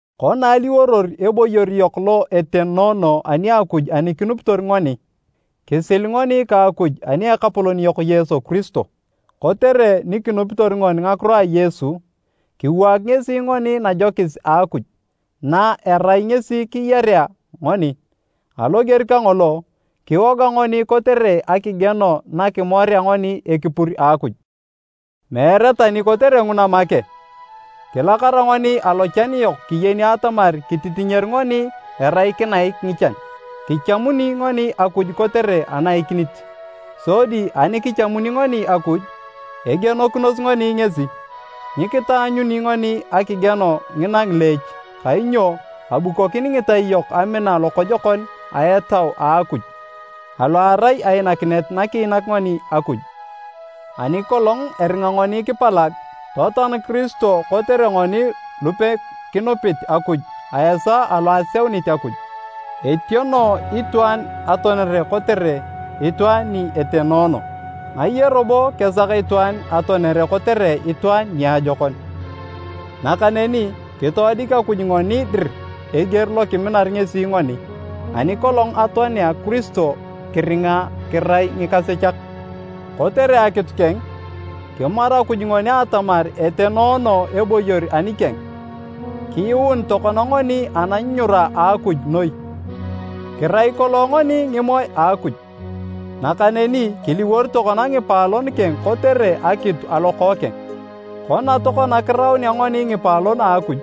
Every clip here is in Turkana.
Kona aliworor eboyor yok lo etenoono ani Akuj ani kinupitor ngoni, kisil ngoni ka Akuj ani Ekapolon yok Yesu Kiristo. Kotere ni kinupitor ngoni ngakiro a Yesu, kiwaak ngesi ngoni najokis a Akuj, na erai ngesi kiyarea ngoni. Aloger kangolo, kiwoga ngoni kotere akigieno na kimorea ngoni ekipur a Akuj! Meere tani kotere nguna make, kilakara ngoni alochan yok kiyeni atamar kititinyer ngoni erai kinaik ngichan, kichamuni ngoni Akuj kotere anaikinit, sodi ani kichamuni ngoni Akuj, egienokinos ngoni ngesi. Nyikitaanyuni ngoni akigieno ngina ngileech kainyo abukokin ngitai yok amina lokojokon a Etau a Akuj, alo erai ainakinet nakiinak ngoni Akuj. Ani kolong eringa ngoni kipalag, totoan Kiristo kotere ngoni lupekinupit Akuj a esaa alo aseunit Akuj. Etieno itwaan atoanere kotere itwaan ni etenoono. Ngaye robo kesak itwaan atoanere kotere itwaan niajokon. Nakaneni kitoodik Akuj ngoni dir eger lo kiminar ngesi ngoni, ani kolong atoanea Kiristo kiringa kirai ngikasechak! Kotere akitu keng, kimaru Akuj ngoni atamar etenoono eboyor anikeng. Kiyuun tokona ngoni ananyunyura a Akuj noi! Kirai kolong ngoni ngimoe a Akuj, nakaneni kiliwor tokona ngipaalon keng kotere akitu a Lokookeng. Kona tokona kiraunea ngoni ngipaalon a Akuj,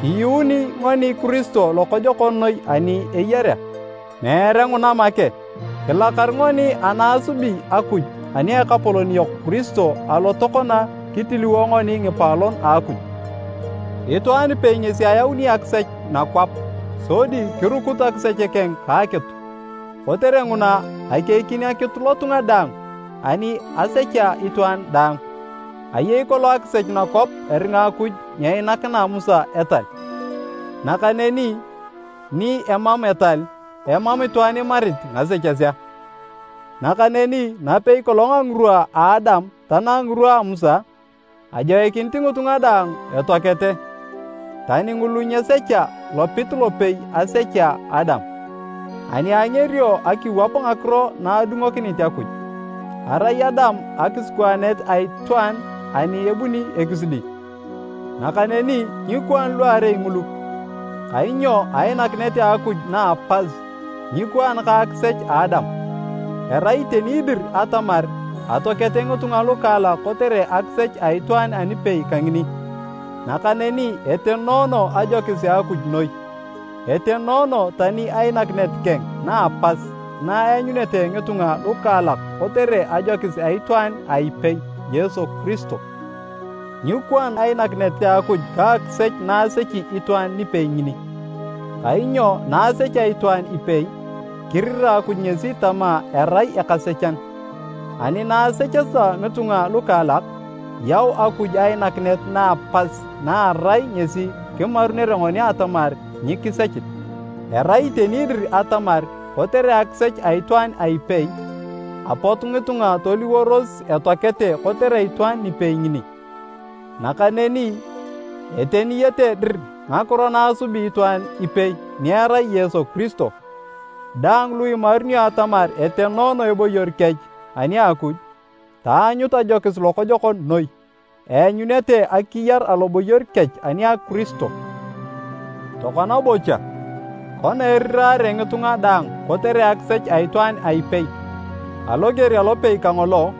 kiyuuni ngoni Kiristo lokojokon noi ani eyarea. Meere nguna make, kilakar ngoni ana asubi Akuj ani a Ekapolon yok Kiristo alo tokona kitiliwo ngoni ngipaalon a Akuj. Itwaan ipei ngesi ayauni akisech nakwap. Sodi kirukut akisech keng ka akitu. Kotere nguna, akeikin akitu lotunga daang ani asechea itwaan daang. Ayei kolong akisech nakwap eringa Akuj nyeinakina Musa etal. Nakaneni ni emam etal, emam itwaan imarit ngasechesea. Nakaneni napei kolong a ngirwa a Adam tanang ngirwa a Musa, ajoikinit ngitunga daang etoakete. Tani ngulu nyesecha lopit lopei asechea Adam, ani angerio akiwap ngakiro na adungokinit Akuj. Arai Adam akisikwaanet a itwaan ani ebuni ekisidi. Nakaneni nyikwaan luarei ngulu, kainyo ainakinet a Akuj na a pas, nyikwaan ka akisech a Adam. Erai iteni dir atamar atoakete ngitunga lukaalak kotere akisech a itwaan anipei kangini. Nakaneni etenoono ajokis a Akuj noi. Etenoono tani ainakinet keng na a pas na eanyunete ngitunga lukaalak kotere ajokis a itwaan a ipei, Yesu Kiristo. Nyikwaan ainakinet a Akuj ka akisech na asechi itwaan nipei ngini, kainyo na asechea itwaan ipei, kirira Akuj ngesi tama erai ekasechan. Ani na asecheta ngitunga lukaalak, yau Akuj ainakinet na a pas na erai ngesi kimarunere ngoni atamar nyikisechit. Erai iteni dir atamar kotere akisech a itwaan a ipei, apot ngitunga toliworos etoakete kotere itwaan nipei ngini. Nakaneni, eteniyete dir ngakiro naasubi itwaan ipei ni erai Yesu Kiristo. Daang lu imarunio atamar etenoono eboyor kech ani a Akuj, taanyut ajokis lokojokon noi, eanyunete akiyar aloboyor kech ani a Kiristo. Tokona bocha, kona erirare ngitunga daang kotere akisech a itwaan a ipei, aloger alopei kangolo,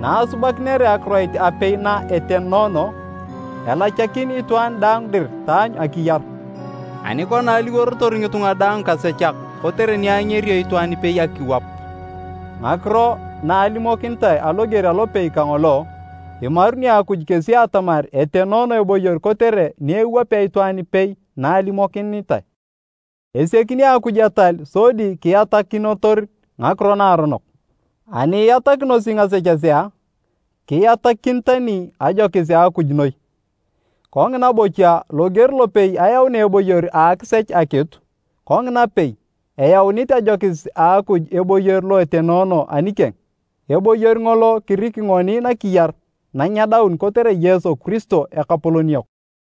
na asubakinere akiroit apei na etenoono, elachakin itwaan daang dir taanyu akiyar. Ani kona aliworotor ngitunga daang ngikasechak kotere ni angerio itwaan ipei akiwap ngakiro na alimokinitae aloger alopei kangolo, imaruni Akuj kesi atamar etenoono eboyor kotere ni ewapea itwaan ipei na alimokinitae. Esiakini Akuj etal sodi kiatakinotor ngakiro naaronok. Ani iatakinosi ngasechesea, kiatakin tani ajokis a Akuj noi. Kongina bocha, loger lopei ayaunea eboyor a akisech akitu, kongina pei, eyaunit ajokis a Akuj eboyor lo etenoono anikeng. Eboyor ngolo kiriki ngoni nakiyar nanyedaun kotere Yesu Kiristo, Ekapolon yok.